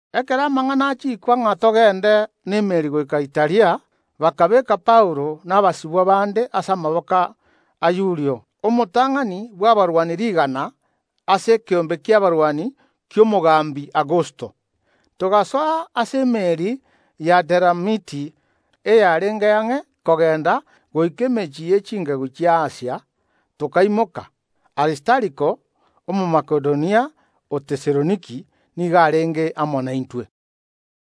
Ekero amang’ana achiikwa ng’a togende n’emeeri goika Italia, bakabeeka Paulo na abasibwa bande ase amaboko a Yulio, omotang’ani bw’abarwani rigana ase ekeombe ki’abarwani ki’omogambi Augusto. Togasoa ase emeeri y’Aderamiti eyarenge ang’e kogenda goika emechie ye chingegu chi’Asia, tokaimoka. Aristariko, Omomakedonia o Tesaloniki, nigo arenge amo naintwe.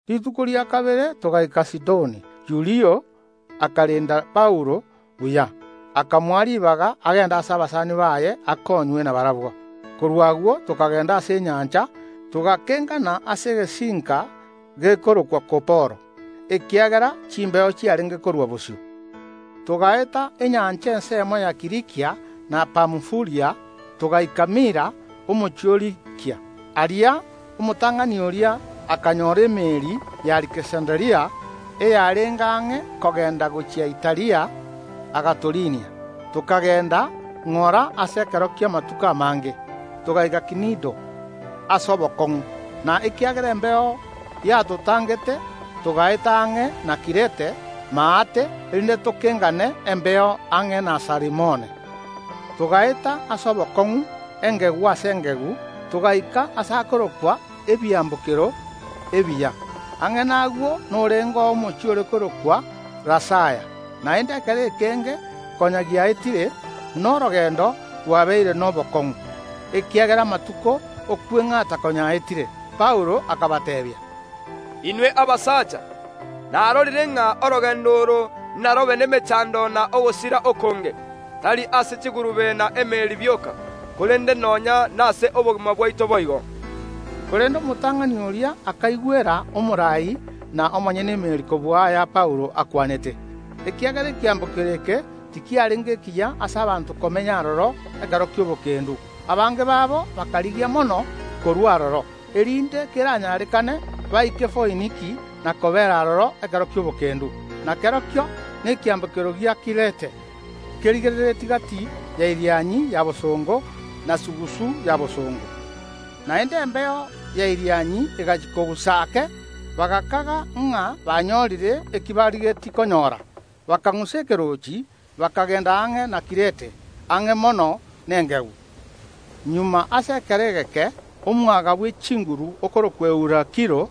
Rituko rikobwatia togaika Sidoni. Yulio akarenda Paulo buya, akamoa ribaga agende ase abasani baye akonywe nabarabwo. Korwa agwo tokagenda ase enyancha, togakengana ase egesinka gekorokwa Kuporo, ekiagera chimbeo chiarenge korua bosio. Togaeta enyancha ensemo ya Kilikia na Pamfulia, togaika Mira, omochie o Likia. Aria omotang’ani oria akanyora emeeri y’Aleksanderia eyarenge ang’e kogenda gochia Italia, agatoriinia. Tokagenda ng’ora ase ekero ki’amatuko amange, togaika Kinido ase obokong’u, na ekiagera embeo yatotangete, togaeta ang’e na Kirete maate, erinde tokengane embeo ang’e na Salimone. Togaeta ase obokong’u engegu ase engegu, togaika aase akorokwa Ebiambokero Ebiya. Ang’e nagwo norengeo omochie ore korokwa Lasaya. Naende ekero ekenge konya giaetire, na orogendo rwabeire nobokong’u, ekiagera amatuko ’okweng’ata konya aetire, Paulo akabateebia, “Inwe abasacha, narorire ng’a orogendo oro narobe nemechando na ogosira okonge, tari ase chigurube na emeeri bioka, korende nonya nase obogima bwaito boigo.” Korende omotang’ani oria akaigwera omoraai na omonyene emeeri kobua aya Paulo akwanete. Ekiagera ekiambokero eke tikiarenge ekiya ase abanto komenya aroro ekero gi’etoigo, abange babo bakarigia mono korua aroro, erinde keranyarekane, baike Foiniki na kobeera aroro ekero ki’obokendu. Na kerokio nekiambokero gia Kirete, kerigereretie gati ya Irianyi ya bosongo na sugusu ya bosongo. Naende embeo ya Irianyi egachia kogusa ake, bagakaga ng’a banyorire eki barigetie konyora, bakang’usa ekeroochi, bakagenda ang’e na Kirete, ang’e mono nengegu. Magega ase ekero egeke omwaga bw’echinguru okorokwa Eurakilo,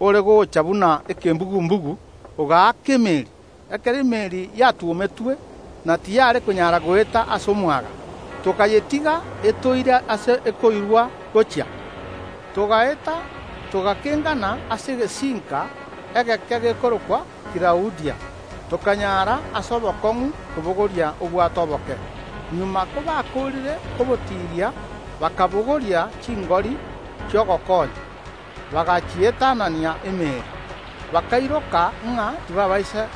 ore gocha buna ekembugu‐mbugu ogaaka emeeri. Ekero emeeri yatwometwe na tiyare konyara goeta ase omwaga, tokayetiga etoire ase ekoirwa gochia. Togaeta togakengana ase egesinka egeke gekorokwa Kilaudia, tokanyara ase obokong’u kobogoria obwato oboke. Magega kobakoorire kobotiria bakabogoria chingori chi’ogokonya, bagachietanania emeeri. Bakairoka ng’a tibaabaisa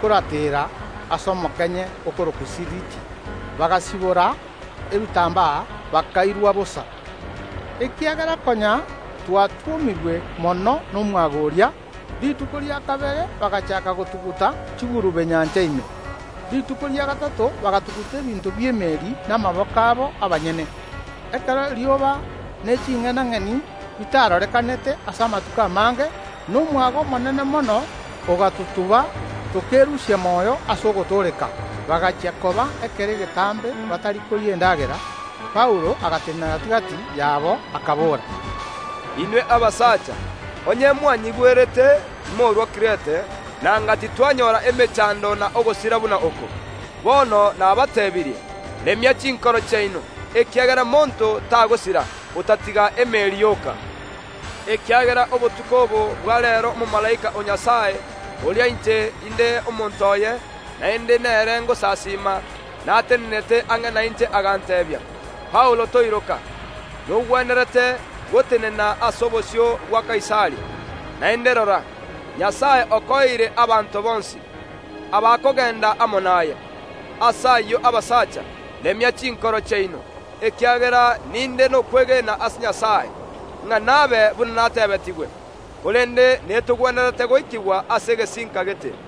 korateera ase omokenye okorokwa Siriti, bagasibora ebitambaa, bakairwa bosa. Ekiagera konya twatwomirwe mono nomwaga oria, rituko ria kabere bagachaaka gotuguta chigurube nyancha ime. Rituko ria gatato bagatuguta ebinto bi’emeeri namaboko abo abanyene. Ekero erioba ne ching’enang’eni bitarorekanete ase amatuko amange, na omwaga omonene mono ogatotuba, tokerusia moyo ase ogotooreka. Bagachia koba ekero egetambe batari koria endagera, Paulo agatenena gati‐gati yabo, akabora: “Inwe abasacha, onye mwanyigwerete timorua Kirete, nanga titwanyora emechando na ogosira buna oko. Bono nabateebirie, remia chinkoro chiaino, ekiagera monto tagosira, otatiga emeeri yoka. Ekiagera obotuko obo bwa reero omomalaika o Nyasae, oria inche inde omonto oye, naende nere ngosasiima, natenenete ang’e nainche aganteebia: Paulo toiroka, nogwenerete gotenena ase obosio bwa Kaisari. Naende rora, Nyasae okoeire abanto bonsi, abakogenda amo naye. Ase ayio abasacha, remia chinkoro chiaino, ekiagera ninde nokwegena ase Nyasae, ng’a nabe buna natebetigwe. Korende netogwenerete goikigwa ase egesinka gete.”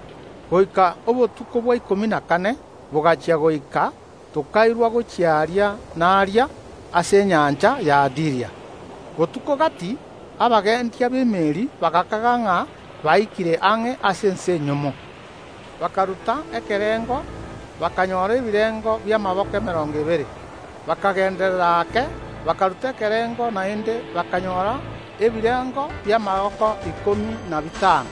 Goika obotuko bwa ikomi na kane bogachia goika tokairwa gochia aria na aria ase enyancha y’Adiria. Botuko gati abagendia b’emeeri bagakaga ng’a baikire ang’e ase ense enyomo. Bakaruta ekerengo, bakanyora ebirengo bi’amaboko emerongo ebere. Bakagenderera ake, bakaruta ekerengo naende, bakanyora ebirengo bi’amaboko ikomi na bitano.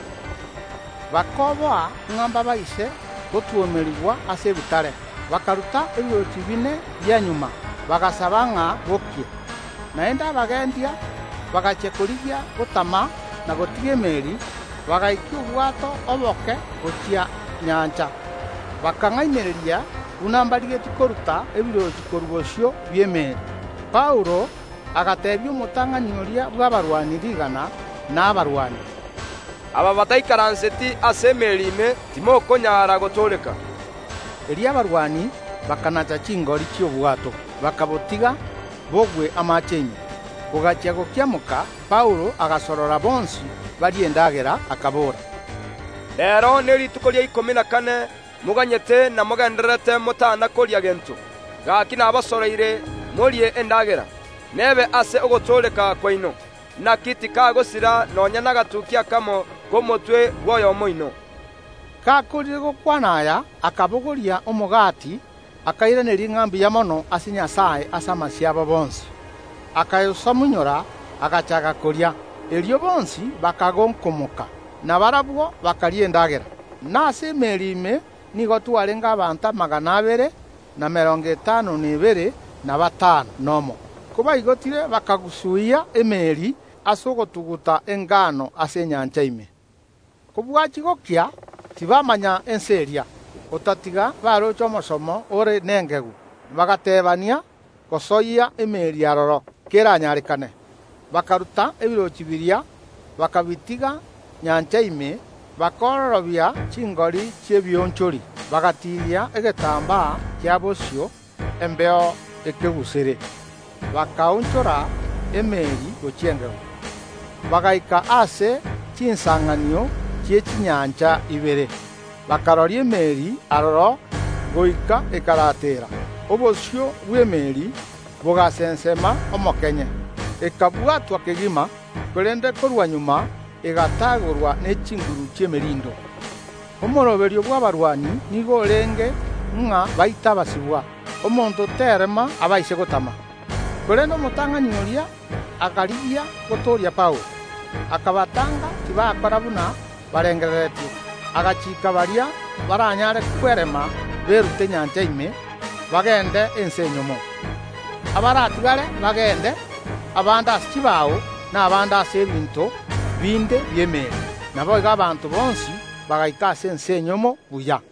Bakoboa ng’a mbaabaise gotwomerigwa ase ebitare, bakaruta ebirochi bine bia magega, bagasaba ng’a bokie. Naende abagendia bagachia korigia gotama na gotiga emeeri, bagaikia obwato oboke gochia nyancha, bakang’ainereria buna mbarigetie koruta ebirochi korwa bosio bw’emeeri. Paulo agateebia omotang’ani oria bw’abarwani rigana, na abarwani: “Aba bataikaranseti ase emeeri ime timokonyara gotooreka.” Erio abarwani bakanacha chingori chi’obwato, bakabotiga bogwe amaache ime. Bogachia gokiamoka Paulo agasorora bonsi barie endagera, akabora: “Reero nerituko ria ikomi na kane moganyete na mogendererete motana koria gento. Gaki nabasoroire morie endagera, nebe ase ogotooreka kwaino; naki tikagosira nonya nagatukia akamo k’omotwe bw’oyomo oino.” Gakoorire gokwana aya, akabogoria omogati akairaneria ng’a mbuya mono ase Nyasae ase amasio abo bonsi, akayosamunyora, agachaaka koria. Erio bonsi bakagonkomoka, na barabwo bakaria endagera. (Na ase emeeri ime nigo twarenge abanto amagana abere, na emerongo etano na ebere, na batano nomo.) Kobaigotire bakagusuyia emeeri ase ogotuguta engano ase enyancha ime. Kobwachia gokia, tibamanya ense eria, otatiga baroche omosomo ore nengegu, bagateebania gosoyia emeeri aroro, keranyarekane. Bakaruta ebirochi biria, bakabitiga nyancha ime, bakaororobia chingori chi’ebionchori, bagatiiria egetambaa kia bosio embeo ekeguserere, bakaonchora emeeri gochia engegu. Bagaika aase chinsanganio chie chinyancha ibere, bakaroria emeeri aroro goika ekarateera; obosio bw’emeeri bogasensema omokenye, ekabwatwa kegima, korende korwa magega egatagorwa ne chinguru chi’emerindo. Omoroberio bw’abarwani nigo orenge ng’a baite abasibwa, omonto tareema abaise gotama. Korende omotang’ani oria akarigia gotooria Paulo, akabataanga, tibakora buna barengereretie. Agachiika baria baranyare komura berute nyancha ime, bagende ense enyomo. Abaratigare bagende, abande ase chibao, na abande ase ebinto binde bi’emeeri. Naboigo abanto bonsi bagaika ase ense enyomo buya.